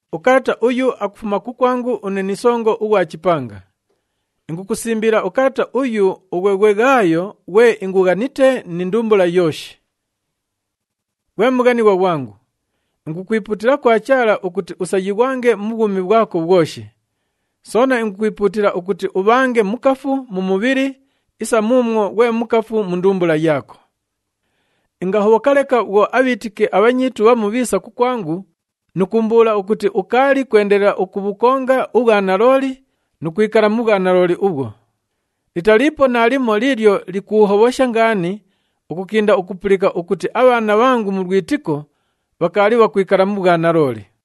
Ukalata uyu akufuma kukwangu une ni songo ughwa chipanga. Ingukusimbila ukalata uyu ughwe ghwe Ghaayo ghwe ingughanite ni ndumbula yooshi. Ghwe mughanighwa ghwangu, ingukwipuutila kwa Chaala ukuti usayighwange mu bhwumi bhwako bhwoshi. Soona ingukwipuutila ukuti ubhange mukafu mu mubhili isa muumwo ghwe mukafu mu ndumbula yaako. Ingahobhoka leka bhwo abhiitiki abhanyiitu bhamu bhiisa kukwangu nu kuumbuula ukuti ukaali kwendelela ukubhukonga ubhwanalooli nu kwikala mu bhwanalooli ubhwo. Litaliipo naalimo liilyo likuuhobhosha ngaani ukukinda ukupulika ukuti abhaana bhangu mu lwitiko bhakaali bhakwikala mu bhwanalooli.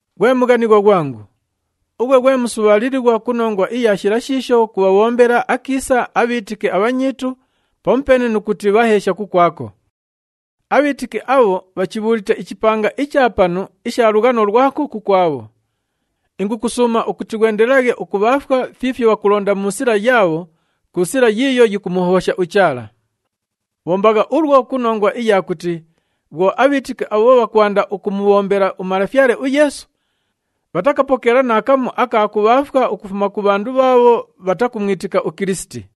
Ghwe mughanighwa ghwangu, ughwe ghwe musubhaalilighwa ku nongwa iya shila shiisho kubhabhombela akiisa abhiitiki abhanyiitu pamupeene nu kuti bhaheesha kukwako. Abhiitiki abho bhachibhuulite ichipanga icha panu isha lughano lwako kukwabho. Ingukusuuma ukuti ghwendelelaghe ukubhaafwa fiifyo bhakulonda mu sila yaabho ku sila yiiyo yikumuhobhosha uChaala. Bhombagha ulwo ku nongwa iya kuti bhwo abhiitiki abho bhakwanda ukumubhombela uMalafyale uYeesu, bhatakapokeela naakamu aka kubhaafwa ukufuma ku bhandu bhaabho bhatakumwitika uKilisiti.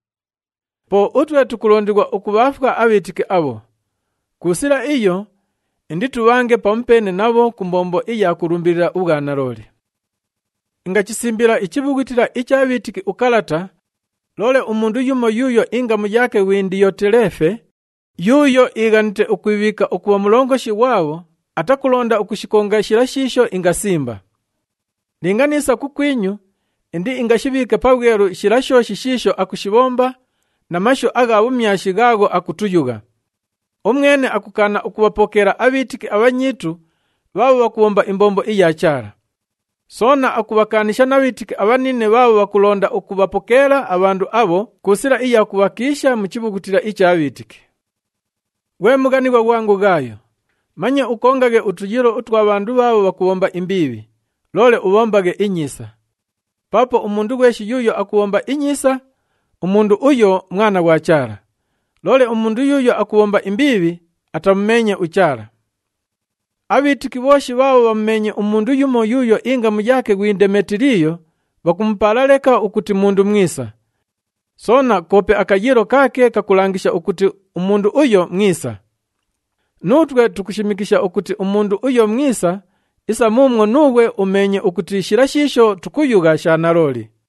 Po utwe tukulondighwa ukubhaafwa abhiitiki abho. Ku sila iyo, inditubhange pamupeene nabho ku mbombo iya kulumbilila ubhwanalooli. Ingachisimbila ichibhughutila icha bhiitiki ukalata, loole umundu yumo yuuyo ingamu yaake ghwi Ndiyoteleefe, yuuyo iighanite ukwibhiika ukubha mulongoshi ghwabho atakulonda ukushikonga shila shiisho ingasimba. Linga niisa kukwinyu, indiingashibhiike pabhwelu shila shooshi shiisho akushibhomba na mashu agha bhumyashi ghaagho ukutuyugha. Umwene akukaana ukubhapokeela abhiitiki abhanyiitu bhaabho bhakubhomba imbombo iya Chaala. Soona akubhakaanisha na bhiitiki abhanine bhaabho bhakulonda ukubhapokeela abhandu abho ku sila iya kubhakiisha mu chibhughutila icha bhiitiki. Ghwe mughanighwa ghwangu Ghaayo, manye ukongaghe utuyiilo utwa bhandu bhaabho bhakubhomba imbiibhi, loole ubhombaghe inyiisa. Paapo umundu ghweshi yuuyo akubhomba inyiisa, umundu uyo mwana ghwa Chaala. Loole umundu yuuyo akubhomba imbiibhi, atamumeenye uChaala. Abhiitiki bhooshi bhaabho bhamumeenye umundu yumo yuuyo ingamu yaake ghwi Ndemetiliyo bhakumupaala leka ukuti mundu mwisa. Soona koope akayiilo kaake kakulangisha ukuti umundu uyo mwisa. Nuutwe tukushimikisha ukuti umundu uyo mwisa isa muumwo nuughwe umeenye ukuti shila shiisho tukuyugha sha nalooli.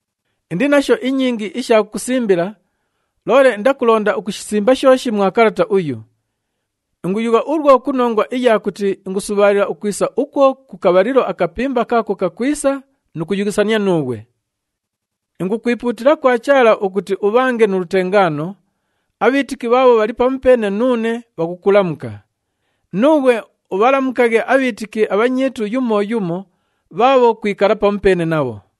Indi nasho inyingi isha kukusimbila, loole indakulonda ukushisimba shooshi mwa kalata uyu. Inguyugha ulwo ku nongwa iya kuti ingusubhaalila ukwisa ukwo ku kabhalilo akapimba kaako kakwisa nu kuyughisania nuughwe. Ingukwipuutila kwa Chaala ukuti ubhange nu lutengaano. Abhiitiki bhaabho bhali pamupeene nuune bhakukulamuka. Nuughwe ubhalamukaghe abhiitiki abhanyiitu yumo yumo bhaabho kwikala pamupeene nabho.